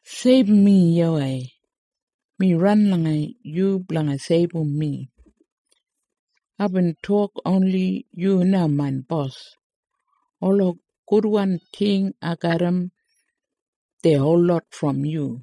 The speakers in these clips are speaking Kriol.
Seibum mi, YAWEI! Mi ran langa yu blanga seibum mi. Aibin tok, “Oni yu na main bos! Ola gudwan ting ai garram, dei holot brom yu.”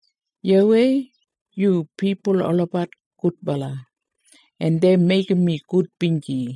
YAWEI, yu pipul olabat gudbala, en dei meigim mi gudbinji.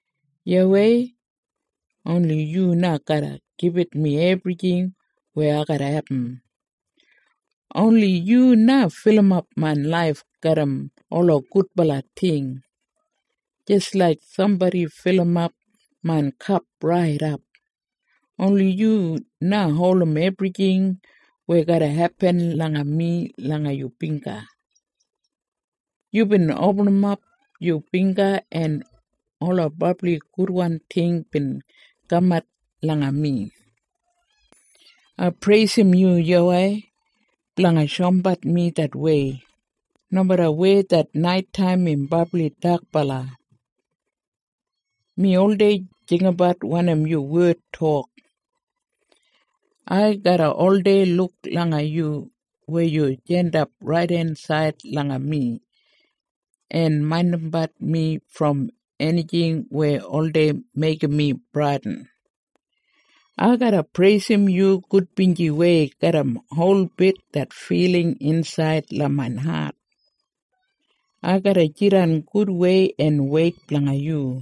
YAWEI, oni yu na garra gibit mi ebrijing weya ai garra abum. Oni yu na filimap main laif garram ola gudbala ting, jis laik sambodi filimap main kap raidap. Oni yu na holdim ebrijing weya garra hepin langa mi langa yu bingga. Yubin opinimap yu bingga en ola brabli gudwan ting bin kamat langa mi. Ai preisim yu, YAWEI, blanga shoumbat mi det wei. Nomeda weya det naitaim im brabli dakbala, mi oldei jinggabat wanim yu wed tok. Ai garra oldei luk langa yu weya yu jandap raidensaid langa mi, en maindimbat mi brom enijing weya oldei meigim mi bradin. Ai garra preisim yu gudbinjiwei garram holbit det filing insaid langa main hat. Ai garra jidan gudwei en weit blanga yu.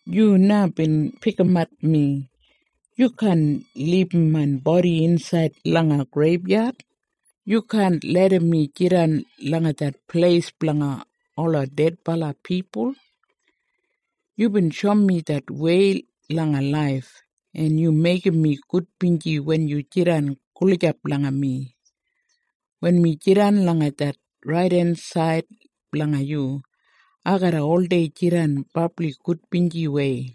Yu na bin pikimat mi. Yu kaan libum main bodi insaid langa greibyad. Yu kaan larram mi jidan langa det pleis blanga ola dedbala pipul. Yubin shoum mi det wei langa laif, en yu meigim mi gudbinji wen yu jidan gulijap langa mi. Wen mi jidan langa det raidensaid blanga yu, ai garra oldei jidan brabli gudbinjiwei.